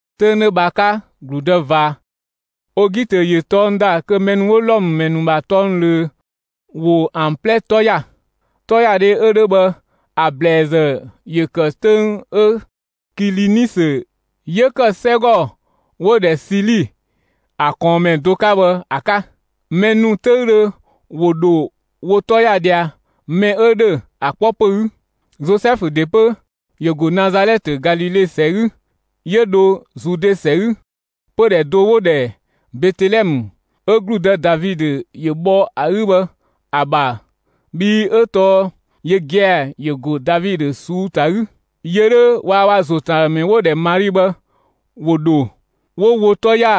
'Töng 'dhö bhë ‑a 'ka, ‑gludë ꞊va Ogitö ‑yö tɔng ‑da kö mɛ ‑nu 'wo Wlɔmë ‑mɛ ‑nu ‑bha tɔng ꞊löö ‑wo ‑an 'plɛ 'tɔ ‑ya. 'Tɔyadhe 'ö 'dhö bhë ‑a ‑blɛɛzë ‑yö ‑kë 'töng 'ö Kilinisö 'yö kë 'sɛgɔ 'wo‑ ‑dhɛ Sili, ‑a ꞊kɔɔnmɛ do 'ka bhë ‑a 'ka. Mɛ ‑nu 'töüdhö ‑wo ‑dho wo 'tɔ ‑ya ꞊dhia, mɛ 'ö ‑dhö ‑a 'kpɔ ‑pö 'gü. Zozɛfu ‑de 'pö ‑yö ‑go Nazalɛtë Galile ‑sɛ 'gü, 'yö dho Zude ‑sɛ 'gü, pödhɛ do 'wo‑ ‑dhɛ Betelɛmë 'ö ‑gludë Davidö ‑yö bhɔ ‑a 'gü bhë ‑a ‑bha, bhii 'ö tɔɔ yö gia‑ ‑yö ‑go Davidö ꞊suu'‑ ‑ta 'gü. Yö 'dhö waa‑ ö bha ‑zo ‑tën ‑a ‑dhë ‑mɛ 'wo‑ ‑dhɛ Mali bhë ‑wo ‑dho 'wo wo 'tɔ ‑ya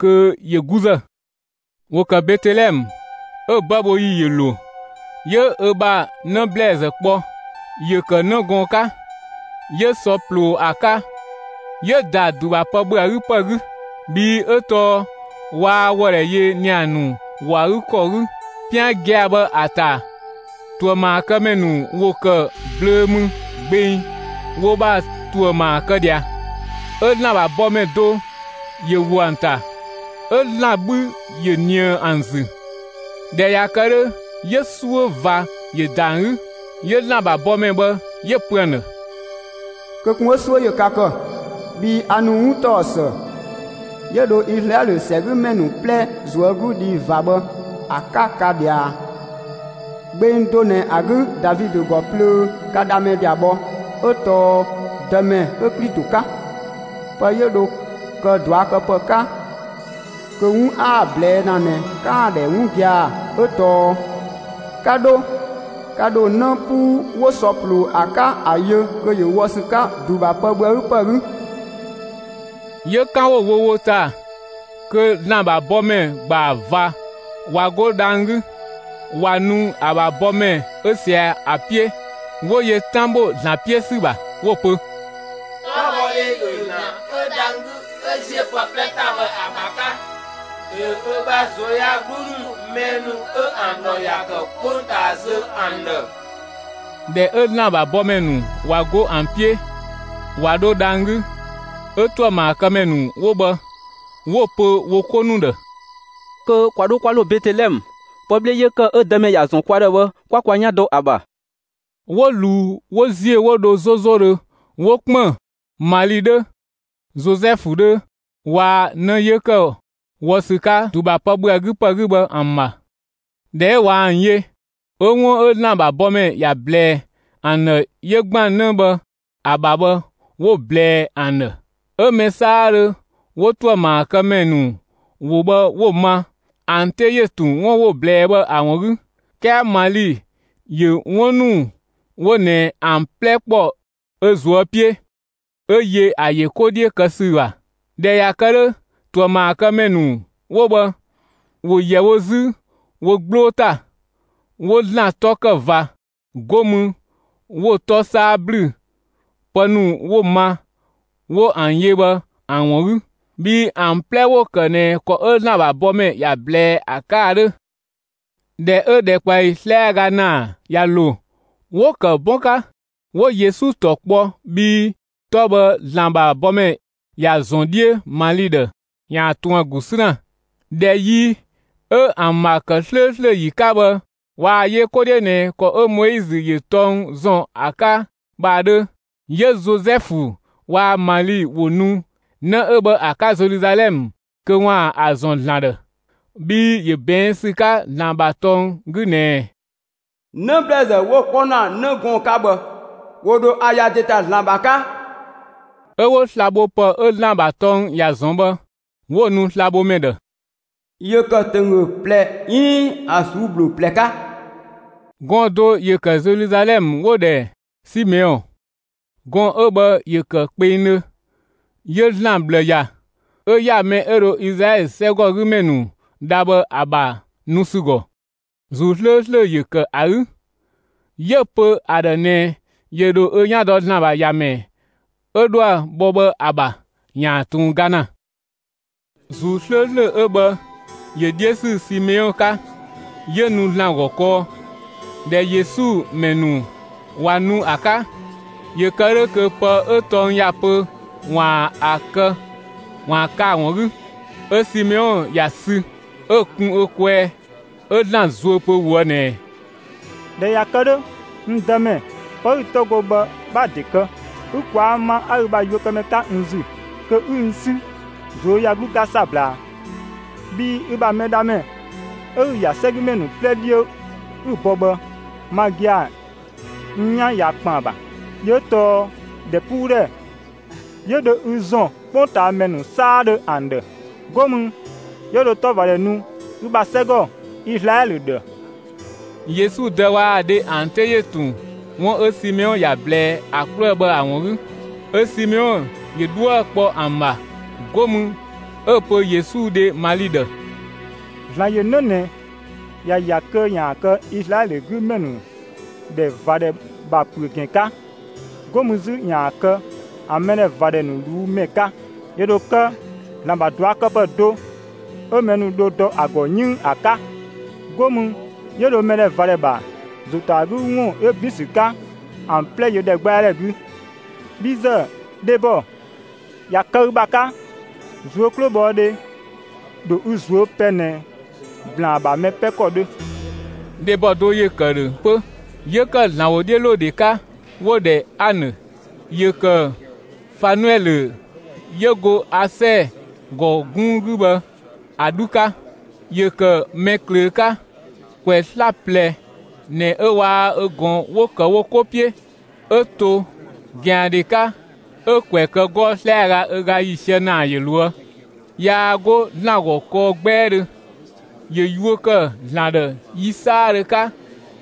kö ‑yö 'guzë. ‑Wo ‑kë Betelɛmë, 'ö‑ 'bëbhoyi ‑yö ‑lo, 'yö ö bha 'në ‑blɛɛzë kpɔ; ‑yö ‑kë 'në gɔɔn‑ 'ka; 'yö sɔ ꞊ploo ‑a 'ka, 'yö‑ ‑da ‑du ‑bha pë ‑bhö ‑a 'gü ‑pë 'gü, bhii 'ö tɔɔ waa wɔdhɛ yö ‑nia ‑nu ‑wɔ ‑a 'gü ‑kɔ 'gü. 'Pian gia‑ bhë ‑a ‑ta ‑tuëmaakëmɛ ‑nu ‑wo ‑kë blöö mü gbeng wo ‑bha ‑tuë ‑maa kë ꞊dhia. 'Ö ‑Zlan ‑bha bɔmɛ do ‑yö ‑wo ‑an ‑ta, 'ö ‑Zlan 'bhü ‑yö ꞊nië ‑an ‑zü. ꞊Dhɛ ꞊ya kë 'dhö, 'yö 'suö ꞊va ‑yö ‑da ‑an 'gü. 'Yö ‑Zlan ‑bha bɔmɛ bhë 'yö‑ pö ‑an ‑dhë: «Kö ꞊kun 'ö 'suö ‑yö ka ‑kë, bhii a ‑nu 'wuntaɔsë 'yö dho Izlaɛlö ‑sɛgümɛ ‑nu 'plɛ ꞊zuögludhi ꞊va bhë ‑a 'ka ka ꞊dhia: Gbeng do ꞊nɛ ‑a 'gü, Davidö ‑gɔ plöö, ka Dhamɛ ꞊ya bhɔ, 'ö tɔɔ Dëmɛ 'ö Klito 'ka. Pë 'yö dho kë ꞊duakëpë 'ka kö 'wun 'a‑ ꞊blɛɛ' ‑na ꞊nɛ 'kaan‑ ‑dhɛ 'wun gia‑ 'ö tɔɔ: 'Ka 'dho, ka ‑dho 'në 'puu 'wo sɔ ꞊ploo ‑a 'ka ‑a yö kö ‑yö wɔ ‑sü 'ka ‑du ‑bha pë ‑bhö ‑a 'gü ‑pë 'gü.» 'Yö 'kan 'wo‑ wo wo ‑ta kö ‑Zlan ‑bha bɔmɛ ‑gbaa ꞊va ꞊wa 'go dhang‑ 'gü, ꞊wa nu ‑a ‑bha bɔmɛ 'ö ꞊sia ‑a 'piö, 'wo yö 'tan bho ‑Zlan 'piö ‑sü ‑bha 'wo‑ pö: «'Tɔbhɔdhe ‑yö ‑Zlan 'yö dhang‑ 'gü 'ö ‑ziö pë 'plɛ ‑ta bhë ‑a ‑bha 'ka; ‑yö ö ‑bha ꞊zuöyagluu ‑nu mɛ ‑nu 'ö ‑an ‑dhɔ ‑ya ‑kë 'kpongtaa zö ‑an ‑dhë.» ꞊Dhɛ 'ö ‑Zlan ‑bha bɔmɛ ‑nu ꞊wa 'go ‑an 'piö ꞊wa 'dho dhang‑ 'gü, 'ö ‑tuëmaakëmɛ ‑nu 'wo bhë 'wo‑ pö wo 'ko ‑nu ‑dhë: «Kö ‑kwa 'dho 'kwa ‑lo Betelɛmë, pë 'bhle 'yö ‑kë 'ö Dëmɛ ‑ya ‑zɔn kwa ‑dhë bhë 'kwa kwa 'yan dɔ ‑a ‑bha!» 'Wo ꞊luu 'wo ‑ziö 'wo dho 'zozodhö 'wo ‑kpën Mali 'dhö, Zozɛfu 'dhö waa‑ 'në 'yö ‑kë wɔ ‑sü 'ka ‑du ‑bha pë ‑bhö ‑a 'gü ‑pë 'gü bhë ‑an ‑bha. ꞊Dhɛ 'ö ꞊wa ‑an yö, 'ö 'wun 'ö ‑Zlan ‑bha bɔmɛ ‑ya ꞊blɛɛ ‑an ‑dhë 'yö ‑gban 'në bhë ‑a ‑bha bhë 'wo‑ ꞊blɛɛ ‑an ‑dhë. 'Ö mɛ 'saadhö 'wo ‑tuëmaakëmɛ ‑nu ‑wo bhë 'wo‑ ma, ‑an 'te ‑yö ‑tun 'wun 'wo‑ ꞊blɛɛ bhë ‑a ‑wun 'gü. 'Kɛɛ Mali ‑yö 'wun ‑nu 'wo ꞊nɛ ‑an 'plɛ ‑kpɔ ö ꞊zuö' 'piö, 'ö yö ‑a ‑yö 'ko 'dhiö kë ‑sü ‑bha. ꞊Dhɛ ꞊ya kë 'dhö, ‑tuëmaakëmɛ ‑nu 'wo bhë 'wo ‑yɛ wo 'zü wo 'gbloo ‑ta, 'wo ‑Zlan 'tɔ ‑kë ꞊va, 'go mü 'wo‑ 'tɔ 'saa ‑blü pë ‑nu 'wo‑ ma, 'wo ‑an yö bhë ‑an ‑wun 'gü, bhii ‑an 'plɛ ‑wo ‑kë ꞊nɛ ‑kɔ 'ö ‑Zlan ‑bha bɔmɛ ‑ya ꞊blɛɛ ‑a 'ka ‑a 'dhö. ꞊Dhɛ 'ö ‑dhɛkpaɔyi 'slɛaga ‑naa ꞊ya ‑lo, 'wo‑ ‑kë 'bɔn 'ka; 'wo‑ Yesu ‑tɔ kpɔ, bhii 'tɔ bhë ‑Zlan ‑bha bɔmɛ ‑ya ‑zɔn 'dhiö Mali ‑dhë ‑yaan ꞊tun ‑a ‑gu 'sü ‑na. ꞊Dhɛ yi 'ö ‑an ‑bha ‑kë 'slööslö ‑yi 'ka bhë ꞊waa‑ yö 'ko 'dhiö ꞊nɛ ‑kɔ 'ö Moizö ‑yö tɔng ‑zɔn ‑a 'ka bhë ‑a 'dhö. 'Yö Zozɛfu waa‑ Mali ‑wo nu 'në 'ö bhë ‑a 'ka Zeluzalɛmë kö ‑waan ‑a ‑zɔn ‑Zlan ‑dhë. Bhii ‑yö ꞊bɛɛn' ‑sü 'ka ‑Zlan ‑bha tɔng 'gü ꞊nɛɛ: 'Në ‑blɛɛzë 'wo 'kpɔ ‑na 'në gɔɔn‑ 'ka bhë, ‑wo ‑dho ‑a ‑ya ‑de ‑ta ‑Zlan ‑bha 'ka. 'Ö 'wo slabhopë 'ö ‑Zlan ‑bha tɔng ‑ya ‑zɔn bhë 'wo‑ nu slabhomɛ ‑dhë; ‑yö ‑kë ‑tönggö ꞊plɛ 'iin ‑an ꞊suu'‑ ‑bhloo ꞊plɛ 'ka. Gɔɔn‑ do ‑yö ‑kë Zeluzalɛmë 'wo‑ ‑dhɛ Simeɔn. Gɔɔn‑ 'ö bhë ‑yö ‑kë kpengdhö; 'yö ‑Zlan ꞊bhlë ‑ya, 'ö ‑ya mɛ 'ö dho Izlaɛlö ‑sɛgümɛ ‑nu dha bhë ‑a ‑bha nu ‑sü ‑gɔ. ‑Zuu 'slööslö ‑yö ‑kë ‑a 'gü. 'Yö‑ pö ‑a ‑dhë ꞊nɛ ‑yö ‑dho ö 'yan dɔ ‑Zlan ‑bha ‑Yamɛ 'ö dhoë‑ bɔ bhë ‑a ‑bha ‑yaan ꞊tun ga ‑na. ‑Zuu 'slööslö 'ö bhë ‑yö 'dhiö ‑sü Simeɔn 'ka, 'yö nu ‑Zlan ‑gɔ kɔɔ. ꞊Dhɛ Yesu ‑mɛ ‑nu ꞊wa nu ‑a 'ka, ‑yö kë 'dhö kö pë 'ö tɔng ‑ya pö ‑waan ‑a kë ‑a ‑wun 'gü, 'Ö Simeɔn ‑ya sü 'ö‑ kun ö kwɛɛ 'ö ‑Zlan zuö pö ꞊woë' ꞊nɛɛ: «꞊Dhɛ ꞊ya kë 'dhö, n Dëmɛ, pë 'ü‑ 'tɔ go bhë 'bha‑ ‑de kë, ü ꞊kwaa' ma 'a ü bha yuökëmɛ 'ka n ‑zü, kö 'ü n 'sü ꞊zuöyagluu 'ka 'sabla, bhii ü bha Mɛdhamɛ 'ö 'ü‑ ‑ya 'sɛgümɛ ‑nu 'plɛ 'dhiö 'ü‑ bɔ bhë, ma gia‑ n 'yan ꞊ya ‑kpën ‑a ‑bha. Yö 'ö tɔɔ ‑dhɛpuudhɛ 'yö dho ü ‑zɔn 'kpongtaamɛ ‑nu 'saadhö ‑an ‑dhë. 'Go mü, 'yö dho 'tɔvadhɛ nu ü bha 'sɛgɔ Izlaɛlö ‑dhë.» Yesu dë waa‑ dhe ‑an 'te ‑yö ‑tun 'wun 'ö Simeɔn ‑ya ꞊blɛɛ ‑a 'kluë‑ bhë ‑a ‑wun 'gü. 'Ö Simeɔn ‑yö 'dhuë‑ kpɔ ‑an ‑bha, 'go mü 'ö‑ pö Yesu dhe Mali ‑dhë: «‑Zlan ‑yö 'në ꞊nɛ ‑ya ‑ya kö ‑yaan kë Izlaɛlö 'gü ‑mɛ ‑nu ‑dhɛ ꞊va ‑dhɛ ‑bha ‑püö ‑gɛn 'ka, 'go mü 'zü ‑yaan kë ‑an mɛdhɛvadhɛ ‑nu ꞊luu' ‑mɛ 'ka. ‑Yö ‑dho kë ‑Zlan ‑bha ꞊duakëpë do 'ö mɛ ‑nu dho dɔ ‑a ‑gɔ 'yënng ‑a 'ka. 'Go mü 'yö dho mɛdhɛvadhɛ ‑bha ‑zo ‑ta ‑a 'gü ‑wun 'yö ‑bin ‑sü 'ka, ‑an 'plɛ yö ‑dhɛgbɛadhɛ 'gü. Bhi ‑zë, dhebɔ, ꞊ya kë ü ‑bha 'ka, ꞊zuö' 'klobhɔdhe ‑dho ü ꞊zuö' pɛ ꞊nɛ ‑blaan ‑bha mɛ 'pɛ ‑kɔ 'dhö.» Dhebɔ do ‑yö ‑kë ‑dhö 'pö, 'yö ‑kë ‑Zlan ‑wodhiölodhe 'ka 'wo‑ ‑dhɛ Anë; ‑yö ‑kë Fanuɛlö 'yö go Asɛɛ ‑gɔ 'gunng 'gü bhë ‑a 'dhu 'ka. ‑Yö ‑kë mɛ ꞊klöö 'ka. ‑Kwɛ 'slaplɛ ꞊nɛ 'ö waa‑ ö ꞊gɔn 'wo ‑kë wo 'ko 'piö, 'Ö to ꞊gɛandhe 'ka, 'ö‑ ‑kwɛ ‑kë 'gɔɔ‑ 'slɛaga ö ga ‑yiisië ‑naa ‑yö ꞊loë'. 'Yaa 'go ‑Zlan ‑gɔ kɔɔ 'gbɛɛdhö, 'yö yuö ‑kë ‑Zlan ‑dhë yi 'saadhö 'ka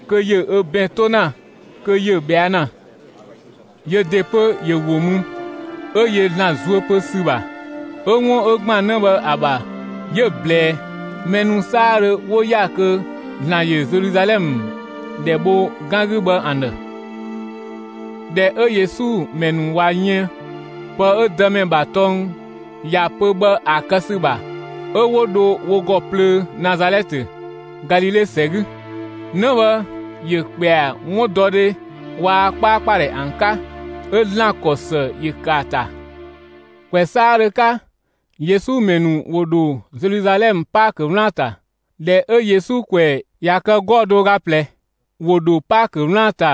kö ‑yö ö ‑bɛn 'to ‑na kö ‑yö ꞊bhɛa' ‑na. Yö ‑de 'pö ‑yö ‑wo mü, 'ö yö ‑Zlan zuö pö ‑sü ‑bha. 'ö 'wun 'ö ‑gban 'në bhë ‑a ‑bha 'yö‑ ꞊blɛɛ mɛ ‑nu 'saadhö 'wo ‑ya kö ‑Zlan ‑yö Zeluzalɛmë ‑dhɛ bho 'gan 'gü bhë ‑an ‑dhë. ꞊Dhɛ 'ö Yesu ‑mɛ ‑nu ꞊wa yën pë 'ö Dëmɛ ‑bha tɔng ‑ya pö bhë ‑a kë ‑sü ‑bha, 'ö 'wo dho wo ‑gɔ plöö Nazalɛtë, Galile ‑sɛ 'gü. 'Në bhë ‑yö ‑kpɛa 'wundɔdhe waa‑ 'kpaakpadhɛ ‑an 'ka; 'ö ‑Zlan ‑kɔ ‑së ‑yö ‑kë ‑a ‑ta. ‑Kwɛ 'saadhö 'ka, Yesu ‑mɛ ‑nu ‑wo ‑dho Zeluzalɛmë Paakö 'wlaan‑ ‑ta. ꞊Dhɛ 'ö Yesu ‑kwɛ ꞊ya kë 'gɔɔ‑ do ö ga ꞊plɛ, ‑wo ‑dho Paakö 'wlaan‑ ‑ta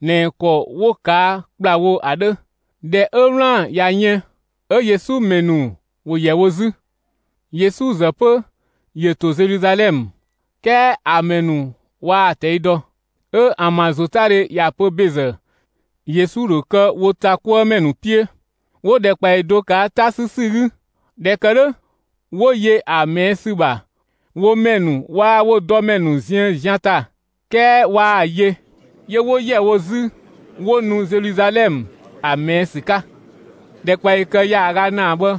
꞊nɛ ‑kɔ 'wo‑ ꞊kaa' ‑kplawo ‑a 'dhö. ꞊Dhɛ 'ö 'wlaan‑ ꞊ya yën, 'ö Yesu ‑mɛ ‑nu ‑wo ‑yɛ wo 'zü; Yesu ‑zë 'pö ‑yö ‑to Zeluzalɛmë, 'kɛɛ ‑a mɛ ‑nu waa‑ ꞊tɛi' dɔ. 'Ö ‑an ‑bha ‑zotadhe ‑ya pö ‑bezë, Yesu ‑dho kë wo ‑ta 'kuë ‑mɛ ‑nu 'piö; 'wo ‑dhɛkpaɔyi do ꞊kaa' 'ta 'sü ‑sü 'gü. ꞊Dhɛ ‑kë 'dhö, 'wo yö ‑a ꞊mɛɛ' ‑sü ‑bha wo ‑mɛ ‑nu waa‑ wo dɔmɛ ‑nu ziën zian ‑ta, 'kɛɛ waa‑ yö. 'Yö 'wo ‑yɛ wo 'zü 'wo nu Zeluzalɛmë ‑a ꞊mɛɛ' ‑sü 'ka. ‑Dhɛkpaɔyi kë ‑yaaga ‑naa bhë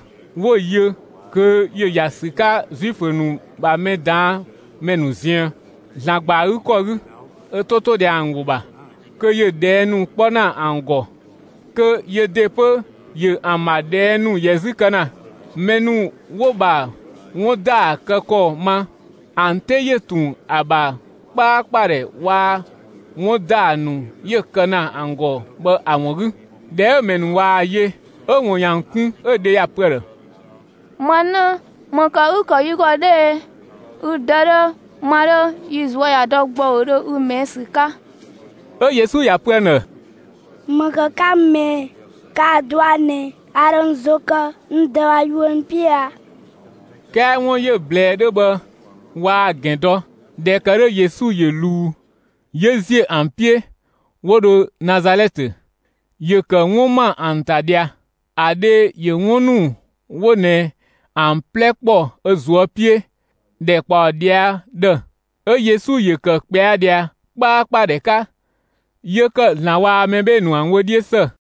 'wo‑ yö kö ‑yö ‑ya ‑sü 'ka Zuifö ‑nu ‑bha mɛ ꞊daan' ‑mɛ ‑nu ziën, ‑Zlan ‑gba ‑a 'gü ‑kɔ 'gü, ö 'to 'to ꞊dhia ‑an ‑wo ‑bha kö ‑yö ꞊dhɛɛ' ‑nu 'kpɔ ‑na ‑an ‑gɔ, kö yö ‑de 'pö, ‑yö ‑an ‑bha ꞊dhɛɛ' ‑nu ‑yɛ 'zü kë ‑na. Mɛ ‑nu 'wo‑ ‑bha 'wun ‑daa ‑kë ‑kɔ ma, ‑an 'te ‑yö ‑tun ‑a ‑bha 'kpaakpadhɛ waa‑ 'wun ‑daa ‑nu 'yö‑ kë ‑na ‑an ‑gɔ bhë ‑a ‑wun 'gü. ꞊Dhɛ 'ö‑ ‑mɛ ‑nu ꞊waa‑ yö, 'ö‑ ‑wun ‑yö ‑an kun, 'ö‑ dhe ‑ya pö ‑a ‑dhë: «Ma 'në, ‑më ‑kë 'ü‑ ‑kë yi ‑gɔ 'dhö e? Ü dë 'dhö, ma 'dhö, yi ꞊zuö' ꞊ya dɔ ‑gbɔudhö ü ꞊mɛɛ' ‑sü 'ka!» 'Ö Yesu ‑ya pö ‑an ‑dhë: «‑Më ‑kë 'ka n ꞊mɛɛ ꞊ɛ? 'Kaa‑ dɔa ꞊nɛ a ‑dho n ‑zo kë n Dë ‑bha yuö ‑nu 'piö a?» 'Kɛɛ 'wun 'yö‑ ꞊blɛɛ 'dhö bhë waa‑ ‑gɛn dɔ. ꞊Dhɛ ‑kë 'dhö Yesu ‑yö ꞊luu, 'yö ‑ziö ‑an 'piö 'wo dho Nazalɛtë; ‑yö ‑kë 'wun ‑ma ‑an ‑ta ꞊dhia. ‑A dhe ‑yö 'wun ‑nu 'wo ꞊nɛ ‑an 'plɛ ‑kpɔ ö ꞊zuö' 'piö ‑dhɛ ꞊kpaɔ ꞊dhia' ‑dhë. 'Ö Yesu ‑yö ‑kë ꞊kpɛa ꞊dhia 'kpaakpadhɛ 'ka; 'yö ‑kë ‑Zlan waa‑ mɛ 'bhee‑ ‑nu ‑an wö 'dhiö ‑së.